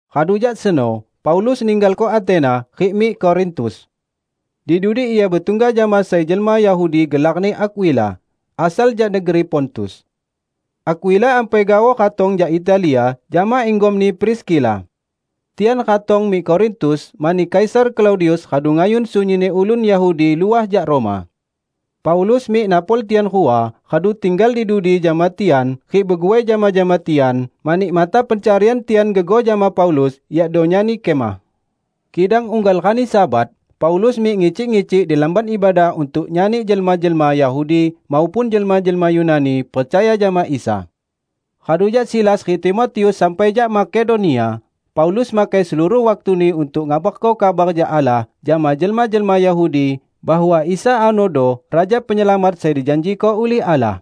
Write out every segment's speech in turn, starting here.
Radu jak seno Paulus ninggalko Atena rik mik Korintus. Di dudi ia betungga jama sai jelma Yahudi gelarni Akwila, asal jak negeri Pontus. Akwila ampai gaoh ratong jak Italia jama inggomni Priskila. Tian ratong mik Korintus mani Kaisar Klaudius radu ngayun sunyinni ulun Yahudi luah jak Roma. Paulus mik napol tian rua, radu tinggal di dudi jama tian rik beguai jama-jama tian, mani mata pencarian tian gegoh jama Paulus, yakdo nyani kemah. Kidang unggal rani Sabat, Paulus mik ngicik-ngicik di lamban ibadah untuk nyani jelma-jelma Yahudi maupun jelma-jelma Yunani, percaya jama Isa. Radu jak Silas rik Timotius sampai jak Makedonia, Paulus makai seluruh waktuni untuk ngabarko kabar jak Allah jama jelma-jelma Yahudi bahwa Isa anodo Raja Penyelamat sai dijanjiko ulih Allah.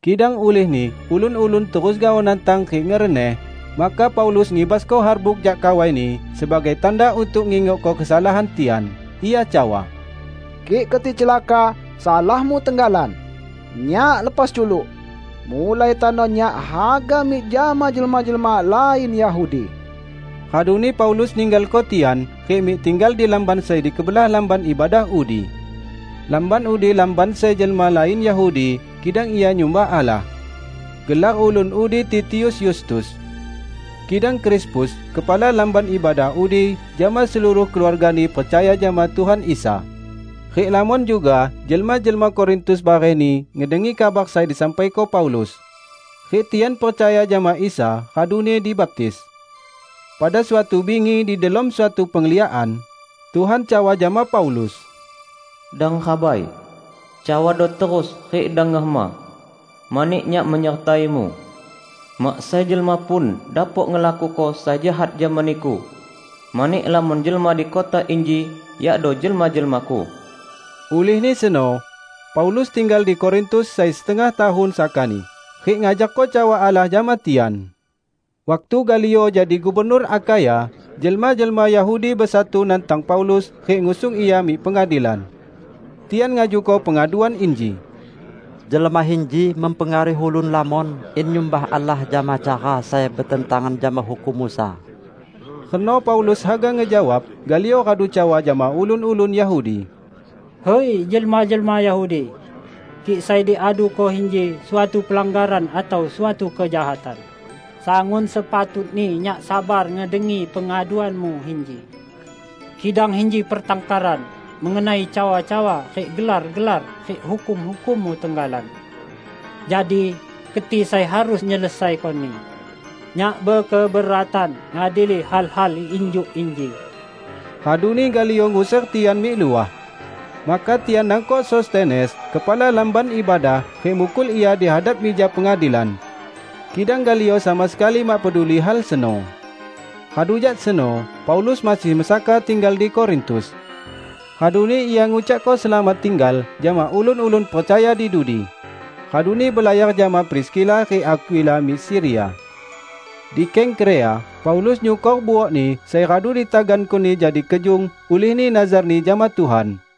Kidang ulihni ulun-ulun terus gaoh nantang rik ngereneh, maka Paulus ngibasko harbuk jak kawaini sebagai tanda untuk ngingokko kesalahan tian. Ia cawa, "Kik keti celaka, salahmu tenggalan! Nyak lepas culuk! Mulai tano nyak haga mik jama jelma-jelma lain Yahudi." Raduni Paulus ninggalko tian rik mik tinggal di lamban sai di kebelah lamban ibadah udi. Lamban udi lamban sai jelma lain Yahudi, kidang ia nyumbah Allah. Gelar ulun udi Titius Yustus. Kidang Krispus, kepala lamban ibadah udi jama seluruh keluargani percaya jama Tuhan Isa. Rik lamon juga jelma-jelma Korintus barehni ngedengi kabar sai disampaiko Paulus, rik tian percaya jama Isa raduni dibaptis. Pada suatu bingi di delom suatu pengliakan, Tuhan cawa jama Paulus, "Dang rabai! Cawado terus rik dang ngehema. Mani Nyak menyertaimu. Mak sai jelma pun dapok ngelakuko sai jahat jama niku, mani lamon jelma di kota inji yakdo jelma-jelma-Ku." Ulihni seno Paulus tinggal di Korintus sai setengah tahun sakani rik ngajarko cawa Allah jama tian. Waktu Galio jadi gubernur Akhaya, jelma-jelma Yahudi besatu nantang Paulus rik ngusung ia mik pengadilan. Tian ngajuko pengaduan inji, "Jelma inji mempengaruhi ulun lamon in nyumbah Allah jama cara sai betentangan jama hukum Musa!" Reno Paulus haga ngejawab, Galio radu cawa jama ulun-ulun Yahudi, "Hui, jelma-jelma Yahudi! Kik sai diaduko inji suatu pelanggaran atau suatu kejahatan, sangun sepatutni nyak sabar ngedengi pengaduanmu inji. Kidang inji pertangkaran mengenai cawa-cawa rik gelar-gelar rik hukum-hukummu tenggalan! Jadi keti sai harus nyelesaikoni. Nyak bekeberatan ngadili hal-hal injuk inji!" Raduni Galio nguser tian mik luah. Maka tian nangkok Sostenes, kepala lamban ibadah, rik mukul ia di hadap mija pengadilan. Kidang Galio sama sekali mak peduli hal seno. Radu jak seno Paulus masih mesaka tinggal di Korintus. Raduni ia ngucakko selamat tinggal jama ulun-ulun percaya di dudi, raduni belayar jama Priskila rik Akwila mik Siria. Di Kengkrea, Paulus nyukor buokni sai radu ditagankoni jadi kejung ulihni nazarni jama Tuhan.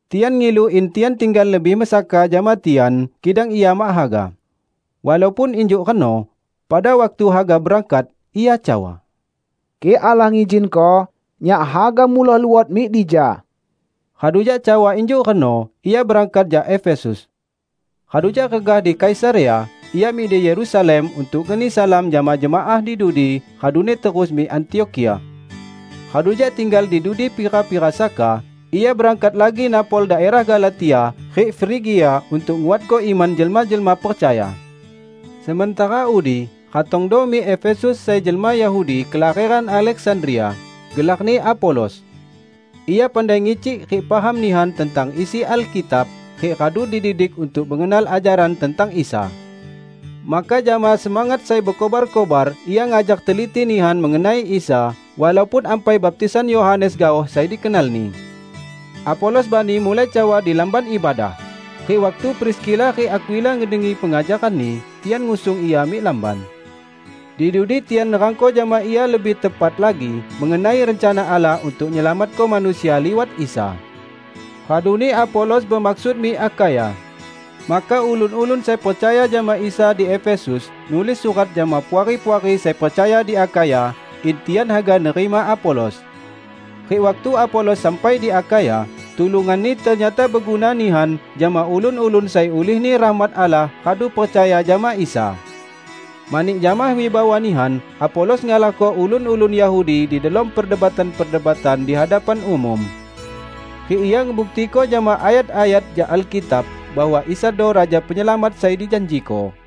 Tian ngilu in ia tinggal lebih mesaka jama tian, kidang ia mak haga. Walaupun injuk reno, pada waktu haga berangkat, ia cawa, "Kik Allah ngizinko, nyak haga muloh luot mik dija." Radu jak cawa injuk reno, ia berangkat jak Efesus. Radu jak regah di Kaisarea, ia mik di Yerusalem untuk ngeni salam jama jemaah di dudi, raduni terus mik Antiokhia. Radu jak tinggal di dudi pira-pira saka, ia berangkat lagi napol daerah Galatia rik Frigia untuk nguatko iman jelma-jelma percaya. Sementara udi, ratongdo mik Efesus sai jelma Yahudi kelaheran Aleksandria, gelarni Apolos. Ia pandai ngicik rik paham nihan tentang isi Alkitab, rik radu dididik untuk mengenal ajaran tentang Isa. Maka jama semangat sai bekobar-kobar ia ngajar teliti nihan mengenai Isa, walaupun ampai baptisan Yohanes gaoh sai dikenalni. Apolos bani mulai cawa di lamban ibadah rik waktu Priskila rik Akwila ngedengi pengajaranni, tian ngusung ia mik lamban. Di dudi tian nerangko jama ia lebih tepat lagi mengenai rencana Allah untuk nyelamatko manusia liwat Isa. Raduni Apolos bemaksud mik Akhaya. Maka ulun-ulun sai percaya jama Isa di Efesus nulis surat jama puari-puari sai percaya di Akhaya in tian haga nerima Apolos. Rik waktu Apolos sampai di Akhaya, tulunganni ternyata beguna nihan jama ulun-ulun sai ulihni rahmat Allah radu percaya jama Isa. Mani jama wibawa nihan Apolos ngalahko ulun-ulun Yahudi di delom perdebatan-perdebatan di hadapan umum. Rik ia ngebuktiko jama ayat-ayat jak Alkitab bahwa Isado Raja Penyelamat sai dijanjiko.